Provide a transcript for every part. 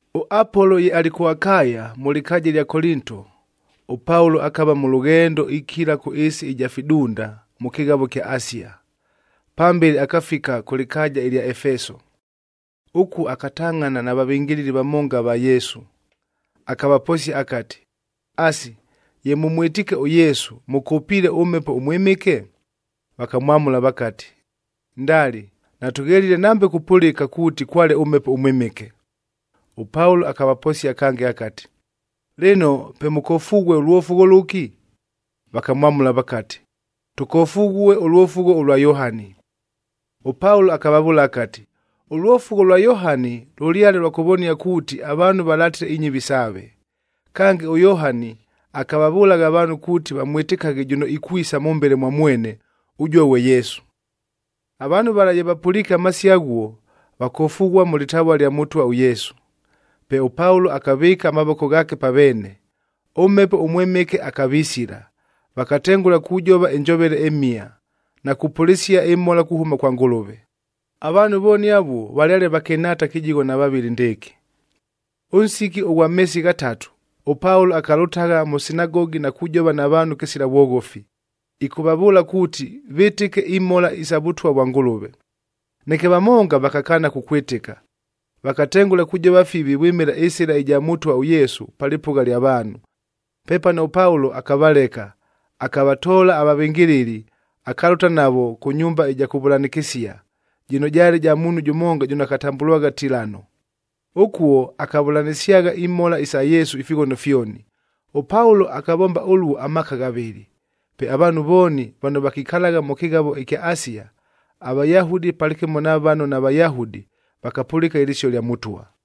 ɄApolo ye alɨ kʉ Akaya, mʉ lɨkaaja ɨlya Kolinto, ʉPaulo akava mʉ lʉghendo ikila kʉ ɨɨsi ɨja fidunda, mʉ kɨghavo ɨkya Asia. Pambele akafika kʉ lɨkaaja ɨlya Efeso. Ʉkuo akatangʼhana na vavɨngɨlɨli vamonga ava Yesu, akavaposia akati, “Asi, ye mʉmwɨtiike ʉYesu, mʉkʉpiile ʉMhepo ʉMwɨmɨke?” Vakamwamʉla vakati, “Ndali! Natʉghelile nambe kupʉlɨka kuuti kwale ʉMhepo ʉMwɨmɨke.” ɄPaulo akavaposia kange akati, “Lɨno, pe mʉkofughue ʉlwofugho lʉki?” Vakamwamʉla vakati, “Tʉkofughue ʉlwofugho ʉlwa Yohani.” ɄPaulo akavavʉʉla akati, “Ʉlwofugho lwa Yohani lʉlyale lwa kʉvonia kuuti, avaanhu valatile inyɨvi saave. Kange, ʉYohani akavavʉlagha avaanhu kuuti vamwɨtɨkaghe jʉno ikwisa mʉmbele mwa mwene, ʉjuo ghwe Yesu.” Avaanhu vala ye vapʉliike amasio aghuo, vakofughua mʉ lɨtavua ɨlya Mʉtwa ʉYesu. Pe ʉPaulo akavɨɨka amavoko ghaake pa veene, ʉMhepo ʉMwɨmɨke akavisila, vakatengʉla kujova ɨnjovele ɨmhia, na kupʉlɨsia ɨmhola kuhʉma kwa Ngʉlʉve. Avaanhu vooni avuo valyale vakɨnhaata kɨjigho na vavɨlɨ ndɨɨkɨ. Ʉnsiki ʉghwa meesi ghatatu, ʉPaulo akalʉtagha mʉ sinagogi na kujova na vaanhu kɨsila vwoghofi, ɨkʉvavʉʉla kuuti vɨtɨke imhola isa Vʉtwa vwa Ngʉlʉve. Neke vamonga vakakaana kukwɨtɨka, vakatengʉla kujova fivi vwɨmɨla ɨSɨla ɨja Mʉtwa ʉYesua pa lɨpʉgha lya vaanhu. Pepano ʉPaulo akavaleka, akavatoola avavɨngɨlɨli, akalʉta navo kʉ nyumba ɨja kʉvʉlanɨkɨsia, jɨno jaale ja muunhu jʉmonga jʉno akatambʉlwagha Tilano. Ʉkuo akavʉlanɨsyagha imhola isa Yesu ifighono fyoni. ɄPaulo akavomba ʉluo amaaka ghavɨlɨ. Pe avaanhu vooni vano vakikalagha mʉ kɨghavo ɨkya Asia, aVayahudi palɨkɨmo na vano naVayahudi, vakapʉlɨka ɨlɨsio lya Mʉtwa.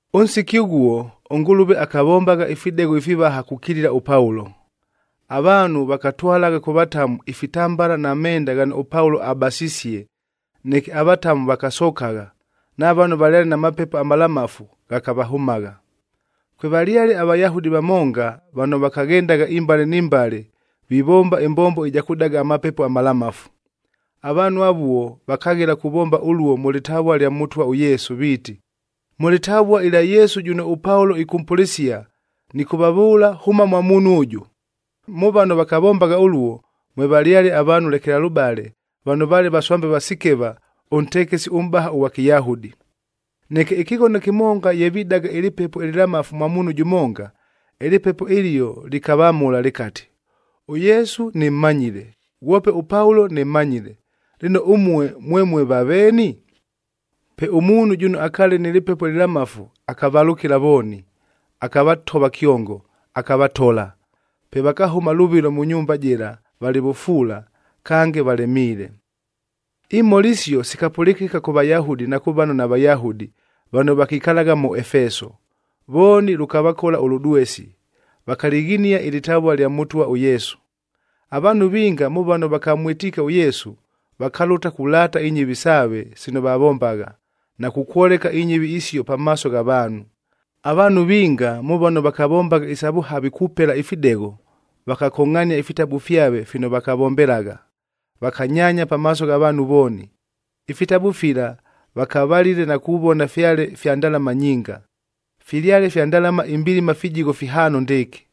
Ʉnsiki ʉghuo, ʉNgʉlʉve akavombagha ifidegho ifivaha kukilila ʉPaulo. Avaanhu vakatwalagha kʉ vatamu ifitambala na menda ghano ʉPaulo abasisie, neke avatamu vakasokagha, na vano valyale na mapepo amalamafu ghakavahʉmagha. Kwevalyale aVayahudi vamonga vano vakaghendagha imbale ni mbale vivomba ɨmbombo ɨja kʉdaga amapepo amalamafu. Avaanhu avuo vakaghela kuvomba ʉluo mʉ lɨtavua lya Mʉtwa ʉYesu viiti, “Mʉ lɨtavua ɨlya Yesu jʉno ʉPaulo ɨkʉmpʉlɨsia, nɨkʉvavʉʉla, hʉma mwa muunhu ʉjʉ!” Mʉ vano vakavombagha ʉluo, mwevalyale avaanhu lekelalʉbale vano vaale vaswambe va Sikeva, ʉntekesi ʉmʼbaha ʉghwa Kɨyahudi. Neke ɨkɨghono kɨmonga ye vidaga ɨlɨpepo ɨlɨlamafu mwa muunhu jʉmonga, ɨlɨpepo ɨlio lɨkavamʉla lɨkati, “ɄYesu nɨmmanyile, ghwope ʉPaulo nɨmmanyile, lɨno ʉmue mwemue vaveeni?” Pe ʉmuunhu jʉno akaale nɨ lɨpepo ɨlɨlamafu akavalʉkɨla vooni, akavatova kyongo, akavatola. Pe vakahʉma lʉvɨlo mʉ nyumba jɨla valɨ vʉfuula, kange valemiile. Imhola isio sikapʉlɨkɨka kʉ Vayahudi na kʉ vano naVayahudi vano vakikalagha mʉ Efeso. Vooni lʉkavakola ʉlʉdwesi, vakalɨghinia ɨlɨtavua ɨlya Mʉtwa ʉYesu. Avaanhu vinga mʉ vano vakamwɨtiike ʉYesu, vakalʉta kulaata inyɨvi saave sino vavombagha, na kukwoleka inyɨvi isio pamaaso gha vaanhu. Avaanhu vinga mʉ vano vakavombagha isa vʉhavi kupela ifidegho, vakakongʼhania ifitabu fyave fino vakavombelagha, vakanyaanya pamaaso gha vaanhu vooni. Ifitabu fila vakavalile na kuvona fyale fya ndalama nyinga. Filyale fya ndalama imbilima fijigho fihaano ndɨɨkɨ,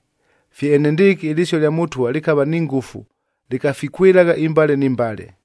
Fye enendɨɨkɨ ɨlɨsio lya Mʉtwa lɨkava ni ngʉfu lɨkafikwɨlagha imbale ni mbale.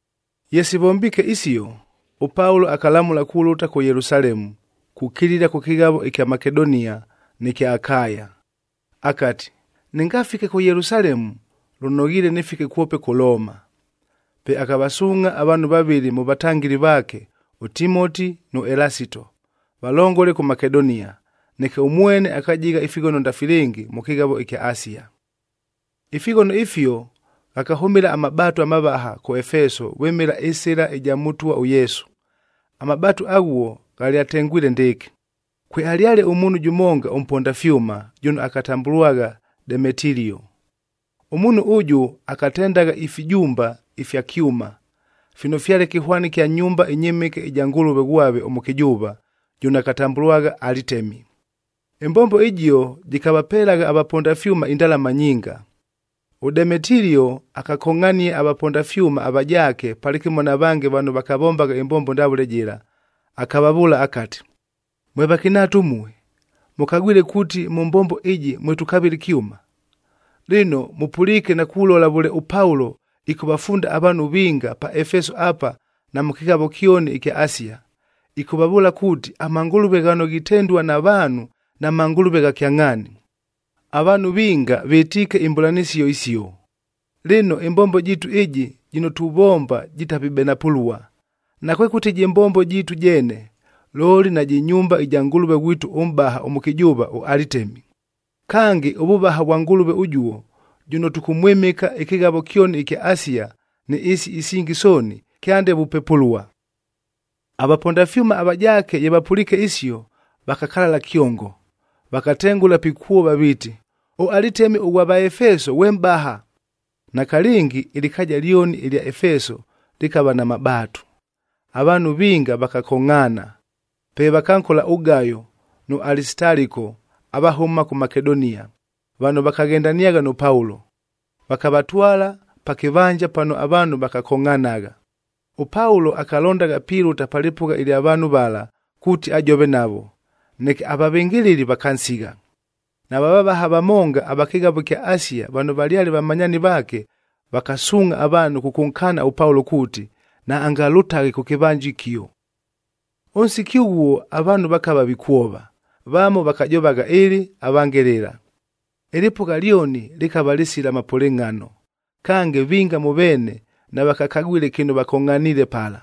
Ye sivombiike isio, ʉPaulo akalamʉla kulʉta kʉ Yelusalemu, kukilila kʉ kɨghavo ɨkya Makedonia nɨ kya Akaya. Akati, “Nɨngafike kʉ Yelusalemu, lʉnoghiile nɨfike kwope kʉ Looma.” Pe akavasuungʼha avaanhu vavɨlɨ mʉ vatangɨli vaake ʉTimoti nʉ Elasito, valongole kʉ Makedonia. Neke ʉmwene akajigha ifighono ndafilɨngi mʉ kɨghavo ɨkya Asia. Ifighono ifio ghakahʉmɨla amabaatu amavaha kʉ Efeso vwɨmɨla ɨSɨla ɨja Mʉtwa ʉYesu. Amabaatu aghuo ghalyatengwile ndɨɨkɨ: Kwealyale ʉmuunhu jʉmonga ʉmponda fyʉma, jʉno akatambʉlwagha Demetilio. Ʉmuunhu ʉjʉ akatendagha ifijumba ifya kyʉma, fino fyale kɨhwani kya nyumba ɨnyɨmɨke ɨja ngʉlʉve ghwave ʉmʉkɨjʉʉva, jʉno akatambʉlwagha Alitemi. Ɨmbombo ɨjio jɨkavapelagha avaponda fyʉma indalama nyinga. ɄDemetilio akakongʼhania avaponda fyʉma avajaake palɨkɨmo na vange vano vakavombagha ɨmbombo ndavʉle jɨla, akavavʉʉla akati, “Mwe vakɨnhaata ʉmue, mʉkagwile kuuti mʉ mbombo ɨjɨ mwe tukavɨla ɨkyʉma. Lɨno, mʉpʉliike na kulola vʉle ʉPaulo ɨkʉvafunda avaanhu vinga pa Efeso apa na mʉ kɨghavo kyoni ɨkya Asia, ɨkʉvavʉʉla kuuti, amangʉlʉve ghano ghitendua na vaanhu namangʉlʉve gha kyangʼhaani. Avaanhu vinga vɨtiike imbʉlanɨsio isio. Lɨno, ɨmbombo jiitu ɨjɨ jɨno tuvomba jitapibenapʉlua, nakwekʉti jɨ mbombo jiitu jeene, looli najɨ nyumba ɨja ngʉlʉve ghwitu ʉmʼbaha ʉmʉkɨjʉʉva ʉAlitemi. Kange, ʉvʉvaha vwa ngʉlʉve ʉjuo, jʉno tʉkʉmwɨmɨka ɨkɨghavo kyoni ɨkya Asia ni ɨɨsi isingi sooni, kyande vupepʉlua.” Avaponda fyʉma avajaake ye vapʉliike isio, vakakalala kyongo, vakatengʉla pikwova viiti, “ɄAlitemi ʉghwa Vaefeso ghwe mʼbaha!” Nakalɨngi ɨlɨkaaja lyoni ɨlya Efeso lɨkava na mabaatu, avaanhu vinga vakakongʼhaana. Pe vakankola ʉGayo nʉ Alisitaliko avahʉma kʉ Makedonia, vano vakaghendaniagha nʉ Paulo, vakavatwala pa kɨvanja pano avaanhu vakakongʼhanagha. ɄPaulo akalondagha pilʉta pa lɨpʉgha ɨlya vaanhu vala kuuti ajove navo, neke avavɨngɨlɨli vakansigha. Nava vavaha vamonga ava kɨghavo ɨkya Asia vano valyale vamanyaani vaake, vakasuungʼha avaanhu kʉkʉnkaana ʉPaulo kuuti, naangalʉtaghe kʉ kɨvanja ɨkio. Ʉnsiki ʉghuo avaanhu vakava vikwova, vamo vakajovagha ɨlɨ, avange lɨla. Ɨlɨpʉgha lyoni lɨkava lɨsila mapʉlɨngʼhano, kange vinga mʉ veene navakakagwile kɨno vakongʼhaniile pala.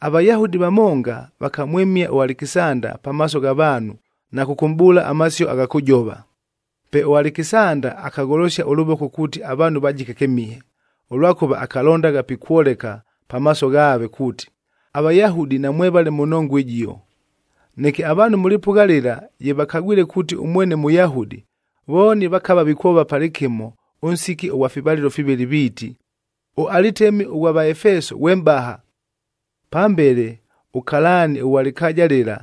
AVayahudi vamonga vakamwɨmia ʉAlekisanda pamaaso gha vaanhu na kʉkʉmʼbʉʉla amasio agha kʉjova. Pe ʉAlekisanda akagholosia ʉlʉvoko kuuti avaanhu vajike kɨmihe, ʉlwakʉva akalondagha pikwoleka pamaaso ghaave kuuti, aVayahudi namwevale mʉ nongua ɨjio. Neke avaanhu mʉ lɨpʉgha lɨla ye vakagwile kuuti ʉmwene Mʉyahudi, vooni vakava vikwova palɨkɨmo ʉnsiki ʉghwa fivalɨlo fivɨlɨ viiti, “ɄAlitemi ʉghwa Vaefeso ghwe mʼbaha!” Pambele ʉkalaani ʉghwa lɨkaaja lɨla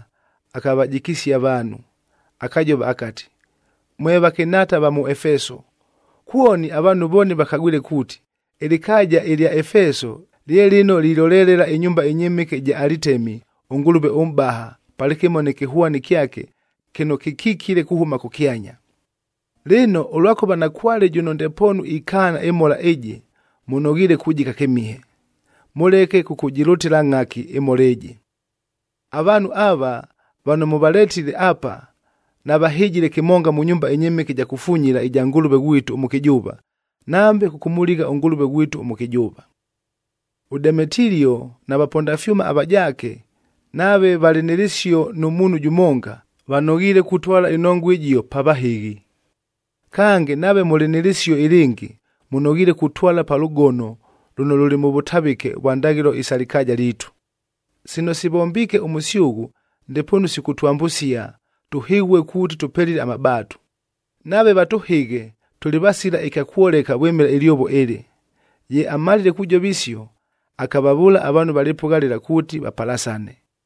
akavajikisia avaanhu. Akajova akati, “Mwe vakɨnhaata va mʉ Efeso, kwoni avaanhu vooni vakagwile kuuti, ɨlɨkaaja ɨlya Efeso lye lɨno lilolelela ɨnyumba ɨnyɨmɨke ɨja Alitemi ʉngʉlʉve ʉmʼbaha, palɨkɨmo nɨ kɨhwani kyake kɨno kɨkikile kuhʉma kʉkyanya. Lɨno, ʉlwakʉva nakwale jʉno ndepoonu ikaana ɨmhola ɨjɨ, mʉnoghiile kujika kɨmihe, mʉleke kʉkʉjɨlʉtɨla ngʼhaki ɨmhola ɨjɨ. Avaanhu ava, vano mʉvaletile apa navahɨjile kɨmonga mʉ nyumba ɨnyɨmɨke ɨja kufunyila ɨja ngʉlʉve ghwitu ʉmʉkɨjʉʉva, nambe kʉkʉmʉligha ʉngʉlʉve ghwitu ʉmʉkɨjʉʉva. ɄDemetilio na vaponda fyʉma avajaake nave valɨ nɨ lɨsio nʉ muunhu jʉmonga, vanoghiile kutwala ɨnongua ɨjio pa vahɨghi. Kange, nave mʉlɨ nɨ lɨsio ɨlɨngɨ, mʉnoghiile kutwala pa lʉgono lʉno lʉlɨ mʉ vʉtavɨke vwa ndaghɨlo isa lɨkaaja liitu. Sino sivombiike ʉmʉsyʉghʉ, ndepoonu sikʉtwambʉsia tʉhɨghue kuuti tʉpelile amabaatu. Nave vatʉhɨghe, tʉlɨ vasila ɨkya kwoleka vwɨmɨla ɨlyovo ɨlɨ.” Ye amalile kujova isio, akavavʉʉla avaanhu va lɨpʉgha lɨla kuuti vapalasane.